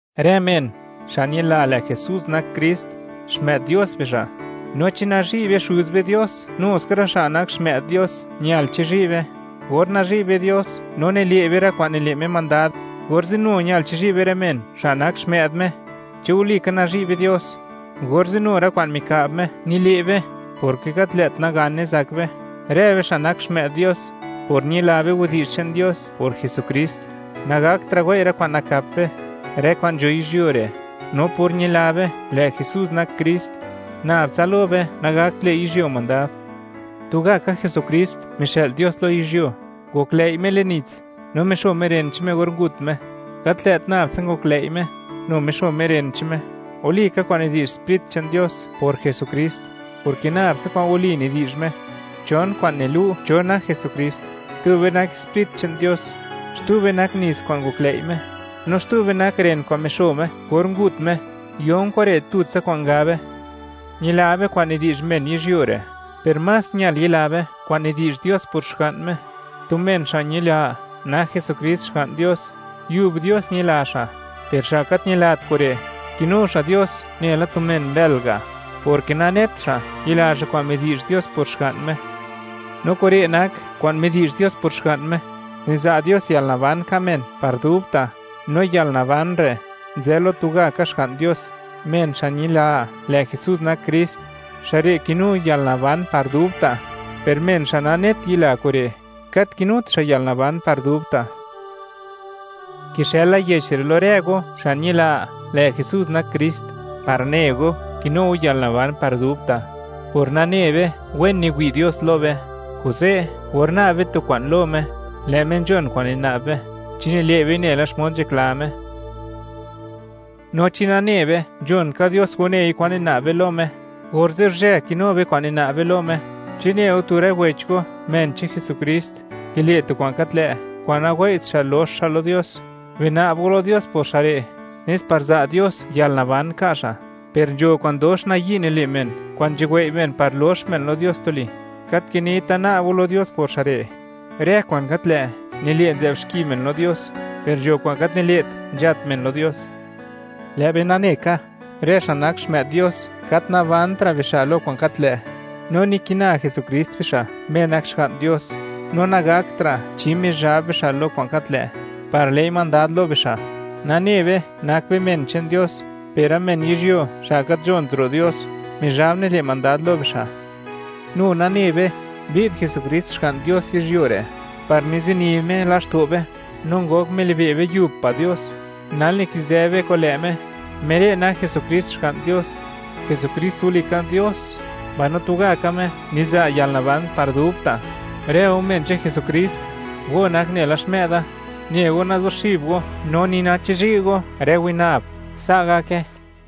Rë men, xa' ñila, lë' Jesús nak Krist, xmë'd Dios bixa'; no chi nazhi' be Xuz be Dios, nu ska rë xa' nak xmë'd Dios ñal chizhi' be. Or nazhi' be Dios no nile' be rë kwa'n nile' Me mandad, orze' nu ñal chizhi' be rë men, xa' nak xmë'd Me. Chi walika nazhi' be Dios, orze' nu rë kwa'n mika'b Me, nile' be; porke gat lë't nagane zak be. Rë be xa' nak xmë'd Dios, por ñila be widi'zh che'n Dios por Jesukrist, nagaktra' wei' rë kwa'n nakap be, rë kwa'n nzho yizhyuo re', no por ñila be, lë' Jesús nak Krist, nab tsa lo be nagakt le' yizhyuo mandad. Tugaka Jesukrist mixë'l Dios lo yizhyuo; ngoklëi' Me le'n nits no mixo Me ren che'n Me or ngut Me. Gat lë't nab tsa ngoklëi' Me; nu mixo Me ren che'n Me. Walika kwa'n nidi'zh Sprit che'n Dios por Jesukrist, porke nab tsa kwa'n wali nidi'zh Me. Chon kwa'n nilu', cho nak Jesukrist: Tube nak Sprit che'n Dios, xtube nak nits kwa'n ngoklëi' Me, no xtube nak ren kwa'n mixo Me or ngut Me. Yon kure', tutsa kwa'n gabe. Ñila be kwa'n nidi'zh men lo yizhyuo re', per más ñal yila be kwa'n midi'zh Dios por Xga'n Me. Tu men xa' ñila, nak Jesukrist Xga'n Dios, yub Dios ñila xa'; per xa' gat ñilat kure', kinu xa' Dios nela tu men mbël ga', porke nanet xa', yila xa' kwa'n midi'zh Dios por Xga'n Me. No kure' nak kwa'n midi'zh Dios por Xga'n Me: Niza' Dios yalnaban ka' men par dubta', no yalnaban re' nzë lo tugaka Xga'n Dios. Men xa' ñila, lë' Jesus nak Krist, xa' re' kinu yalnaban par dubta'; per men xa' nanet yila kure', gat kinut xa' yalnaban par dubta'. Kixëla yech re' lo rë go xa' ñila, lë' Jesús nak Krist, par ne go, kinu go yalnaban par dubta'. Por nane be, wen niwi' Dios lo be, kuze', or na'b be tu kwa'n lo Me, lë' Me nzhon kwa'n nina'b be chi nile' bei nela xmod nzhakla Me. No chi nane be, nzhon ka Dios wanei kwan nina'b be lo Me, orze' guzhë kinu be kwa'n nina'b be lo Me. Chi ne go tu rë wech go, men che'n Jesukrist, kile' tu kwa'n gat lë', kwa'n nawei't xa' lox xa' lo Dios, bina'b go lo Dios por xa' re', nes par za' Dios yalnaban ka' xa'. Per nzho kwa'n dox nayi' nile' men, kwa'n nzhuwei' men par lox men lo Dios tuli; gat kinita na'b go lo Dios por xa' re'. Rë kwa'n gat lë', nile' nzë'b xki men lo Dios, per nzho kwa'n gat nile't, nzhat men lo Dios. Lë' be nane ka, rë xa' nak xmë'd Dios, gat nabanra' bixa' lo kwa'n gat lë', no nikina Jesukrist bixa', Me nak Xga'n Dios, no nagaktra' chi Mizhab bixa' lo kwa'n gat lë', par le'i mandad lo bixa'. Nane be, nak be men che'n Dios, per rë men yizhyuo, xa' gat nzhont ro' Dios, Mizhab nile' mandad lo bixa'. Nu nane be, mbi'd Jesukrist Xga'n Dios yizhyuo re' par mizini Me laxto' be, no ngok milibe' be yub pa' Dios. Nal, nikizë be kun lë' Me, Me re' nak Jesukrist, Xga'n Dios. Jesukrist walika Dios, mbaino tugaka Me niza' yalnaban par dubta'. Rë go men che'n Jesukrist, go nak nela xmë'da, ne go, nazuxib go no ni nachizhi' go rë winab. Sa' gake.